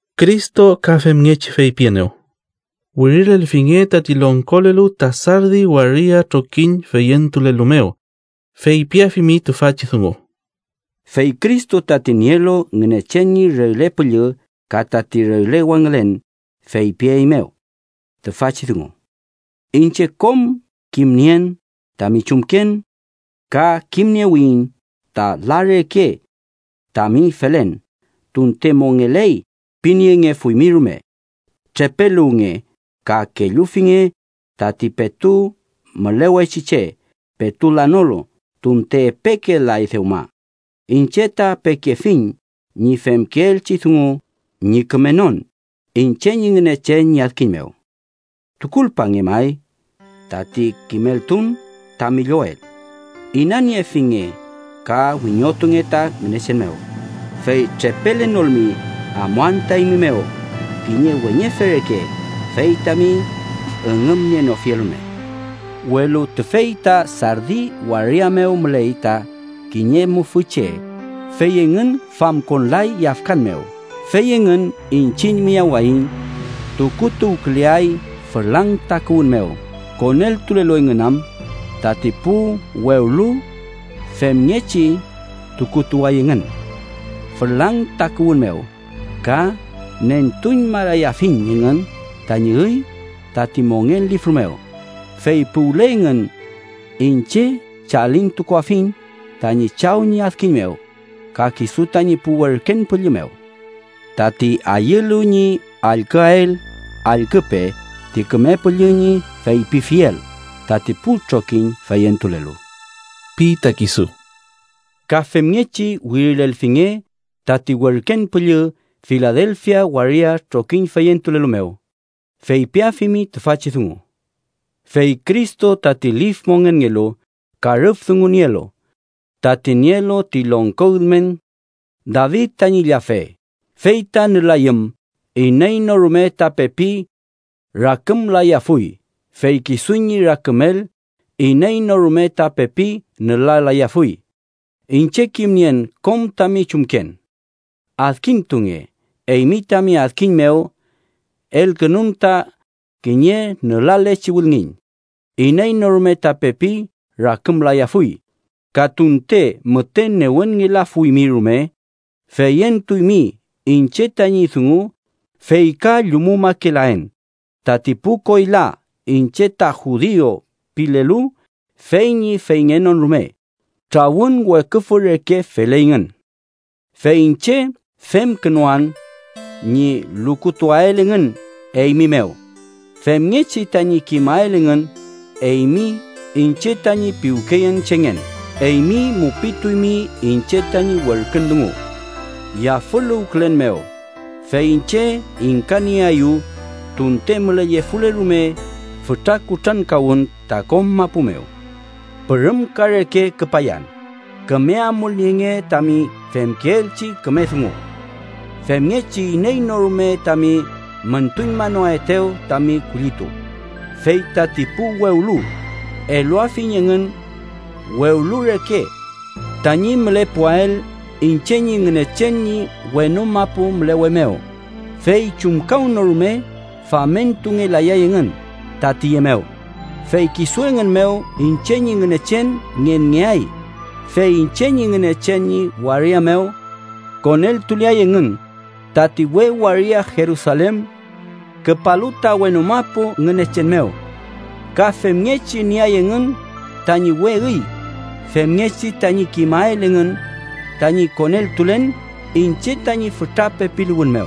“Cristo ka femngechi feypienew: wirilelfinge tati longkolelu ta Sardi waria trokiñ feyentulelu mew. Feypiafimi tüfachi dungu: Fey Cristo tati nielu Ngünechen ñi regle püllü ka tati regle wangülen feypieymew tüfachi dungu: Iñche kom kimnien tami chumken, ka kimniewiyiñ ta la reke tami felen tunte mongeley piniengefuymi rume. Trepeluwnge ka kellufinge tati petu mülewechi che petu lanolu tunte epeke lay dewma, iñche ta pekefiñ ñi femkeelchi dungu ñi kümenon iñche ñi Ngünechen ñi adkiñ mew. Tukulpange, may, tati kimeltun tami llowel. Inaniefinge ka wiñotunge ta Ngünechen mew. Fey trepelenolmi, amuan ta eymi mew kiñe weñefe reke, fey tami üngümnienofiel rume. Welu, tüfey ta Sardi waria mew müley ta kiñe mufü che, fey engün famkonlay yafkan mew, fey engün iñchiñ miyawaiñ tukutuwküleay fülang takuwün mew, koneltulelu engün am. Tati pu wewlu femngechi tukutuway engün fülang takuwün mew, ka nentuñmalayafiñ engün tañi üy tati Mongen Lifru mew, fey puwle engün iñche chalintukuafiñ tañi Chaw ñi adkiñ mew ka kisu tañi pu werken püllü mew. ¡Tati ayülu ñi allküael, allküpe ti Küme Püllü ñi feypifiel tati pu trokiñ feyentulelu! ―pi ta kisu. “Ka femngechi wirilelfinge tati werken püllü Filadelfia waria trokiñ feyentulelu mew. Feypiafimi tüfachi dungu: Fey Cristo tati lif mongenngelu ka rüf dungu nielu, tati nielu ti longko ülmen David tañi llafe, fey ta nülayüm iney no rume ta pepi rakümlayafuy fey kisu ñi rakümel, iney no rume ta pepi nülalayafuy. Iñche kimnien kom tami chumken. Adkintunge, eymi tami adkiñ mew elkünun ta kiñe nülalechi wülngiñ. Iney no rume ta pepi rakümlayafuy, ka tunte müte newenngelafuymi rume feyentuymi iñche tañi dungu fey ka llumumakelaen. Tati pu koyla ‘iñche ta judiu’ pilelu fey ñi feyngenon rume, trawün Weküfü reke feley engün. Fey iñche femkünan ñi lukutuael engün eymi mew, femngechi tañi kimael engün eymi iñche tañi piwkeyenchengen. Eymi mupituymi iñche tañi werkün dungu yafüluwkülen mew, fey iñche ingkanieaeyu, tunte mülellefule rume fütra kutrankawün ta kom mapu mew. Pürümka reke küpayan. Küme amulnienge tami femkeelchi küme dungu, femngechi iney no rume tami müntuñmanoaetew tami kullitu. Fey tati pu wewlu eluafiñ engün wewlu reke tañi mülepuael iñche ñi Ngünechen ñi wenu mapu mülewe mew, fey chumkawnorume famentungelayay engün ta tiye mew. Fey kisu engün mew iñche ñi Ngünechen ngenngeay fey iñche ñi Ngünechen ñi waria mew koneltuleay engün, tati we waria Jerusalen küpalu ta wenu mapu Ngünechen mew. Ka femngechi nieay engün tañi we üy femngechi tañi kimael engün tañi koneltulen iñche tañi fütra pepiluwün mew.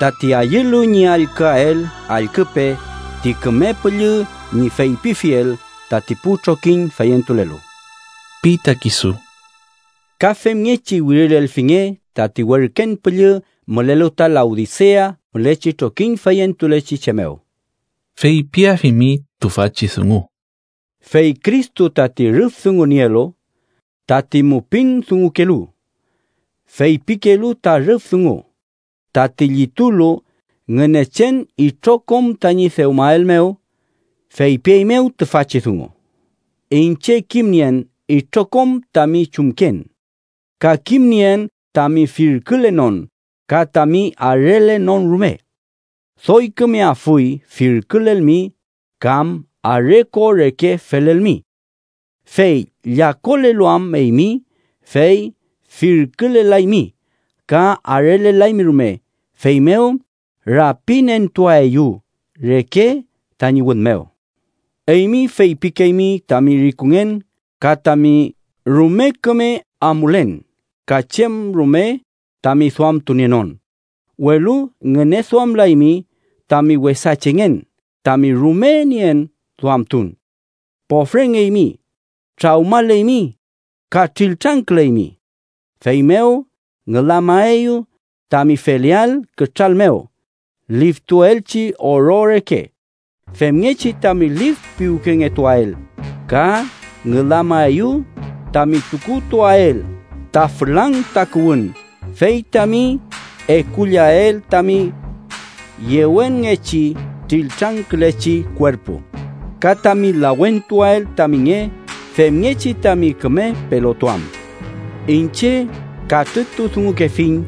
¡Tati ayülu ñi allküael, allküpe ti Küme Püllü ñi feypifiel tati pu trokiñ feyentulelu! ―pi ta kisu. “Ka femngechi wirilelfinge tati werken püllü mülelu ta Laodisea mülechi trokiñ feyentulechi che mew. Feypiafimi tüfachi dungu: Fey Cristo, tati rüf dungu nielu, tati mupin dungukelu, feypikelu ta rüf dungu, tati llitulu Ngünechen itrokom tañi dewmael mew feypieymew tüfachi dungu: Iñche kimnien itrokom tami chumken. Ka kimnien tami firkülenon ka tami arelenon rume. ¡Doy kümeafuy firkülelmi kam are ko reke felelmi! Fey llakolelu am eymi, fey firkülelaymi ka arelelaymi rume, feymew rapinentuaeyu reke tañi wün mew. Eymi feypikeymi tami rikungen ka tami rume küme amulen ka chem rume tami duamtunienon, welu ngüneduamlaymi tami wesa chengen, tami rume nien duamtun, pofrengeymi, trawmaleymi ka triltrangküleymi. Feymew ngülamaeyu tami feleael kütral mew liftuelchi oro reke, femngechi tami lif piwkengetuael. Ka ngülamaeyu tami tukutuael ta fülang takuwün fey tami ekullael tami yewenngechi triltrangkülechi kuerpu, ka tami lawentuael tami nge femngechi tami küme pelotuam. Iñche katrütudungukefiñ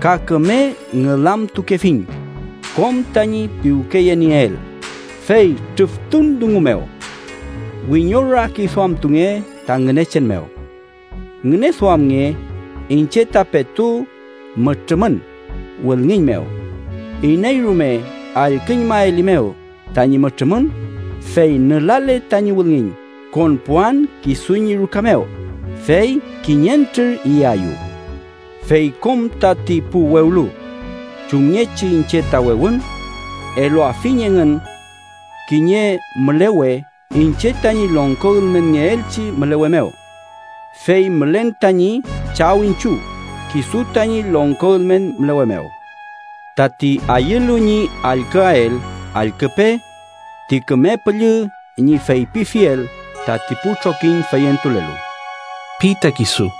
ka küme ngülamtukefiñ kom tañi piwkeyenieel. Fey trüftun dungu mew wiñorakiduamtunge ta Ngünechen mew. Ngüneduamnge, iñche ta petu mütrümün wülngiñ mew. Iney rume allküñmaelimew tañi mütrümün, fey nülale tañi wülngiñ, konpuan kisu ñi ruka mew, fey kiñentrür iyayu. Fey kom tati pu wewlu, chumngechi iñche ta wewün, eluafiñ engün kiñe mülewe iñche tañi longko ülmenngeelchi mülewe mew, fey mülen tañi Chaw iñchiw kisu tañi longko ülmen mülewe mew. ¡Tati ayülu ñi allküael, allküpe ti Küme Püllü ñi feypifiel tati pu trokiñ feyentulelu!” pi ta kisu.